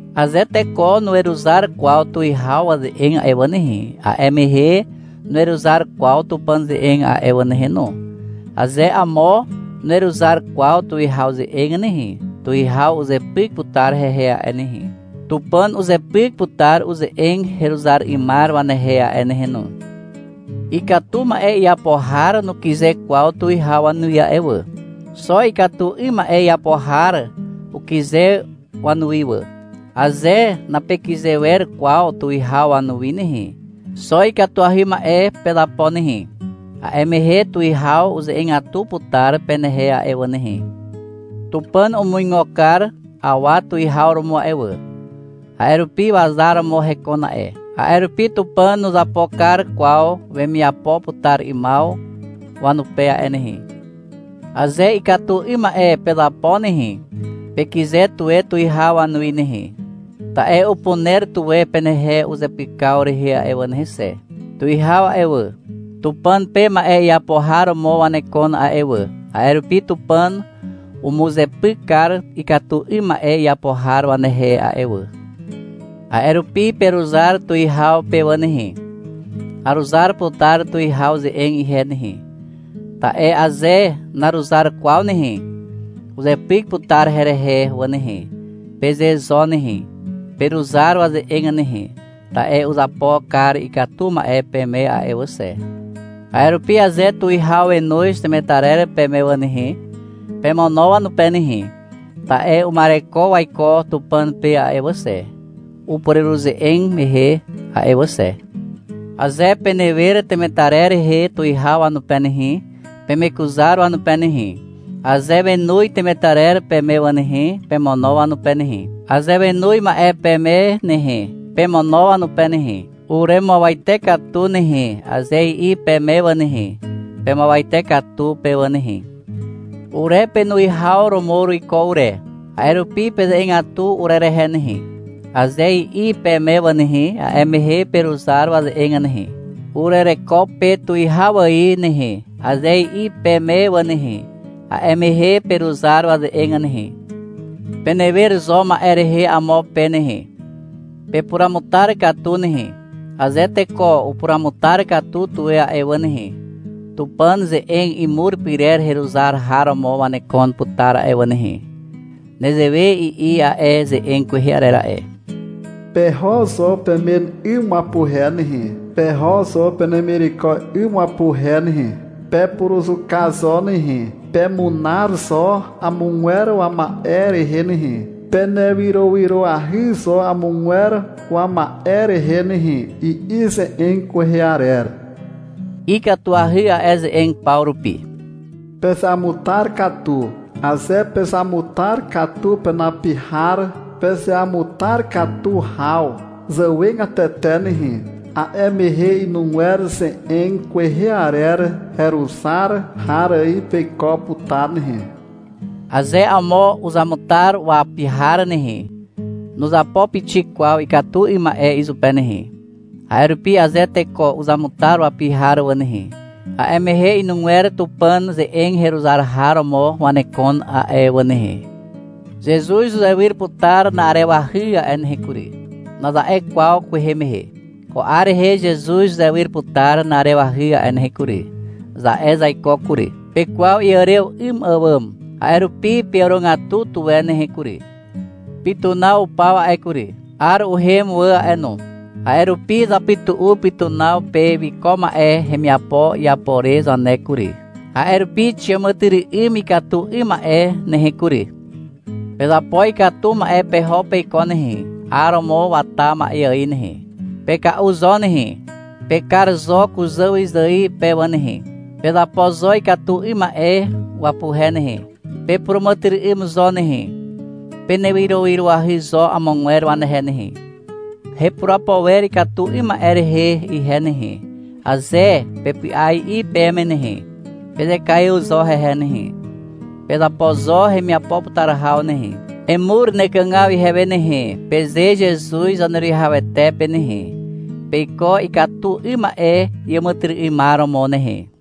Aze teko nuweruzar kwaw tuwihaw waze'eg a'e wà nehe, a'e mehe nuweruzar kwaw Tupàn ze'eg a'e wà nehe no. Aze amo nuweruzar kwaw tuwihaw ze'eg nehe, tuwihaw uzepyk putar hehe a'e nehe. Tupàn uzepyk putar uze'eg heruzar 'ymar wanehe a'e nehe no. Ikatu ma'e iapo har nukyze kwaw tuwihaw wanuwi a'e wà. Xo ikatu 'ym ma'e iapo har ukyze wanuwi wà. Aze napekyze wer kwaw tuwihaw wanuwi nehe, xo ikatuahy ma'e pezapo nehe. A'e mehe tuwihaw uze'egatu putar penehe a'e wà nehe. Tupàn umuigo kar awa tuwihaw romo a'e wà, a'e rupi wazar romo hekon a'e. A'e rupi Tupàn nuzapo kar kwaw wemiapo putar 'ymaw wanupe a'e nehe. Aze ikatu 'ym ma'e pezapo nehe, pekyze tuwe tuwihaw wanuwi nehe, ta'e upuner tuwe penehe uzepykaw rehe a'e wà nehe xe. Tuwihaw a'e wà, Tupàn pe ma'e iapo har romo wanekon a'e wà, a'e rupi Tupàn umuzepyk kar ikatu 'ym ma'e iapo har wanehe a'e wà. A'e rupi peruzar tuwihaw pe wà nehe. — Aruzar putar tuwihaw ze'eg ihe nehe, ta'e aze naruzar kwaw nehe, uzepyk putar herehe wà nehe, peze zo nehe. Peruzar waze'eg nehe, ta'e uzapo kar ikatu ma'e peme a'e wà xe. A'e rupi aze tuwihaw wenoz temetarer peme wà nehe, pemono wanupe nehe. Ta'e uma'ereko waiko Tupàn pe a'e wà xe, upureruze'eg mehe a'e wà xe. Aze penewer temetarer rehe tuwihaw wanupe nehe, pemekuzar wanupe nehe. Aze wenoz temetarer peme wà nehe, pemono wanupe nehe. Aze wenoz ma'e peme nehe, pemono wanupe nehe. — Uremuawate katu nehe, aze i'i peme wà nehe, pemuawate katu pe wà nehe. — Ure penuwihaw romo uruiko ure, a'e rupi peze'egatu urerehe nehe, aze i'i peme wà nehe, a'e mehe peruzar waze'eg nehe. Urereko pe tuwihaw ài nehe, aze i'i peme wà nehe, a'e mehe peruzar waze'eg nehe. Penewer zo ma'e rehe amo pe nehe. Pepuruamutar katu nehe. Aze teko upuruamutar katu tuwe a'e wà nehe, Tupàn ze'eg imur pyrer heruzar har romo wanekon putar a'e wà nehe. Nezewe i'i a'e ze'eg kwehe arer a'e. — Peho zo pemen 'ym wapuhe nehe, peho zo penemireko 'ym wapuhe nehe. Pepuruzuka zo nehe. Pemunar zo amogwer wama'e rehe nehe. Penewyrowyroahy zo amogwer wama'e rehe nehe, i'i ze'eg kwehe arer. Ikatuahy a'e ze'eg paw rupi. Pezeamutar katu. Aze pezamutar katu penapi har pezeamutar katu haw zàwegatete nehe, a'e mehe inugwer ze'eg kwehe arer heruzar har ài peiko putar nehe. Aze amo uzamutar wapi har nehe, nuzapo pixik kwaw ikatu 'ym ma'e izupe nehe. A'e rupi aze teko uzamutar wapi har wà nehe, a'e mehe inugwer Tupàn ze'eg heruzar har romo wanekon a'e wà nehe. — Zezuz uzewyr putar na'arewahy a'e nehe kury, naza'e kwaw kwehe mehe. Ko 'ar rehe Zezuz uzewyr putar na'arewahy a'e nehe kury, za'e zaiko kury. Pekwaw iàrew 'ym àwàm. A'e rupi peàrogatu tuwe nehe kury. Pytunaw upaw a'e kury. 'Ar uhem wà a'e no. A'e rupi zapytu'u pytunaw pe wiko ma'e hemiapo iapo re zane kury. A'e rupi xiàmàtyry'ym ikatu 'ym ma'e nehe kury. Pezapo ikatu ma'e peho peiko nehe, 'ar romo wata ma'e ài nehe. Peka'u zo nehe. Pekar zo kuzà wyzài pe wà nehe. Pezapo zo ikatu 'ym ma'e wapuhe nehe. Pepuràmàtyry'ym zo nehe. Penewyrowyroahy zo amogwer wanehe nehe. — Hepurapo wer ikatu 'ym ma'e rehe ihe nehe, aze pepy'a i'i peme nehe, pezekaiw zo hehe nehe. Pezapo zo hemiapo putar haw nehe. — Emur nekàgaw ihewe nehe, peze Zezuz Zaneruwihawete pe nehe. Peiko ikatu 'ym ma'e iàmàtyry'ymar romo nehe.